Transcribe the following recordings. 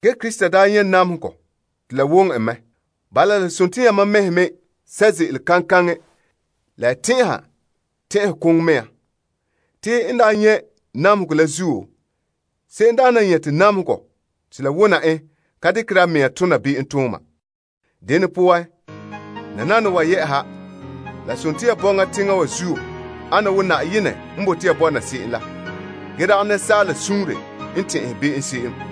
Krista daa nyɛ' namehegɔ te la woŋɛ en. Bala, la sontii yamam mɛhe mɛ sɛ' ze'ele kaŋkaŋɛ la ya tɛn'ɛha tɛn'ɛkoŋo mea me. Te n daa nyɛ' namehegɔ la zuo, se'emdaana n nyɛte namehegɔ te la wona en ka dekere a mea tona be'emtooma. Dene poan, nananawa yɛ'ɛha, la sontii ya bɔŋa teŋa wa zuo ana wo Na'ayenɛ sunboolom. Ge dagɛ asaala suunre n tɛn'ɛhɛ be'em se'em.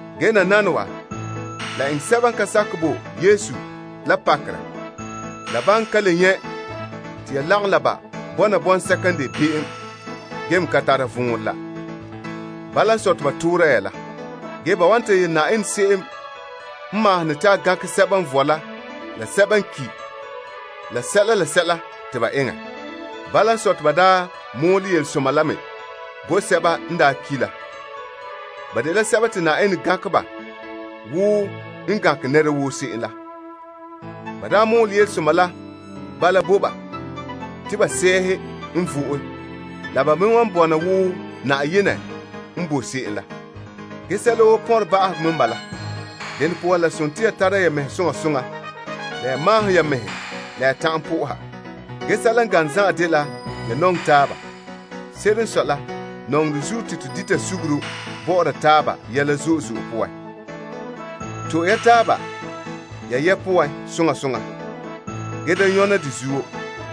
Ge nananawa, la eŋɛ sɛba n ka sakɛ bo Yesu la pakerɛ la ban ka le nyɛ' te ya lagom la ba bɔna bɔŋsɛka n de be'em ge me ka tara vɔnrɛ la. Bala n sɔe, te ba toora ya la. Ba wan ta yele Na'ayenɛ se'em n maahom ne te a gankɛ sɛba n vɔe la sɛba n ki' la sɛla te ba eŋɛ. Bala n sɔe, te ba daa mɔɔlɛ yelesoma la me bo sɛba n daa ki' la. Ba dela sɛba te Na'ayenɛ gankɛ ba wo n wan gankɛ nɛra woo se'em la. Ba daa mɔɔlɛ yelesoma la bala bo ba te ba sɛɛhe poan, la ba me wan bɔna wo Na'ayenɛ n bo se'em la. Ge sɛla woo pɔnre ba'ahegɔ mɛ n bala. Dene poan la sontii ya tara ya mɛhe soŋa soŋa la ya maahom ya mɛhe la ya ta'an soha. Sɛla n gane zan'an dela ya nɔŋɛ taaba. Se'ere n sɔe la, nɔŋerɛ zuo te to dita suguru bɔ'ɔra taaba yɛla zo'e zo'e poan. To'e ya taaba ya yɛ' poan soŋa soŋa ge da nyɔna de zuo.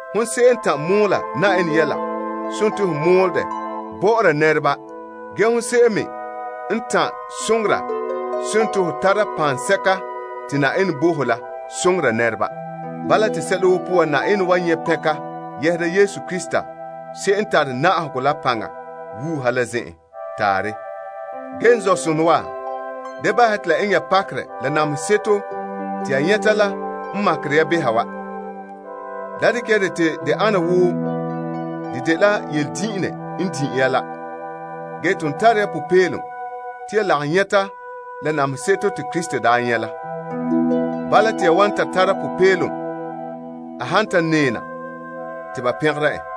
Hon se'em n ta'an mɔɔla Na'ayenɛ yɛla, sontii ho mɔɔla dɛ bɔ'ɔra nɛreba ge hon se'em me n ta'an soŋora sontii ho tara paŋsɛka te Na'ayenɛ bo ho la soŋora nɛreba. Bala, te sɛla woo poan, Na'ayenɛ wan nyɛ' pɛnka yɛhera Yesu Krista se'em n tare na'ahegɔ la paŋa wuuha la zen'en. Taarɛ. N zɔ'sonɔ wa, da bahɛ ya te la eŋɛ ya pakerɛ la namehe seto te ya nyɛta la n makere ya behɛ wa. Da dekɛ ya dɛ te de ana wo de dela yeledin'inne n din' ya la. Ge ton tare ya popeelom te ya lagom nyɛta la namehe seto te Krista daa nyɛ' la. Bala, te ya wan ta tara popeelom a han ta nɛɛna te ba pɛngera en.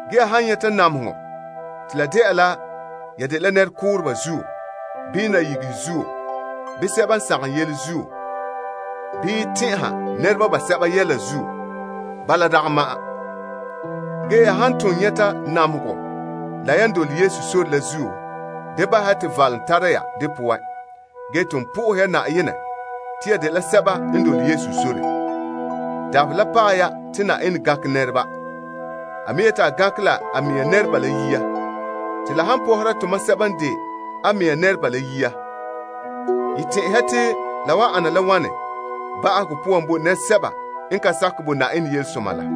Ge ya han nyɛta namehegɔ te la dela ya dela nɛrekooreba zuo, bii nayigehe zuo, bii sɛba n sagom yele zuo, bii tɛn'ɛha nɛreba basɛba yɛla zuo, bala dagɛ ma'an. Ge ya han ton nyɛta namehegɔ la yan dole Yesu sore la zuo, da bahɛ ya te valom tara ya de poan. Ge ton ya bo Na'ayenɛ fara te ya dela sɛba n dole Yesu sore. Dabaherɛ la paɛ ya te Na'ayenɛ gankɛ nɛreba. A me yeti a gankɛ la a mea nɛreba la yia. Te la han pɔhera tomam sɛba n de a mɛŋa nɛreba la yia, ya tɛn'ɛhe te la wan ana la wane ba'ahegɔ poan bo nɛresɛba n ka sakɛ bo Na'ayenɛ yelesoma la?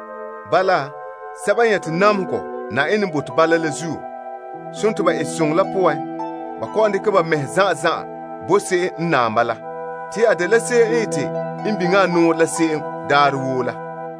Bala, sɛba n nyɛte namehegɔ Na'ayenɛ sunboolom, sontii ba etesoŋɔ la poan, ba kɔ'ɔn dekɛ ba mɛhe zan'an zan'an bo se'em n naam ba la. Te a dela se'em n ete n biŋe a nɔɔrɛ la se'em daarɛ woo la.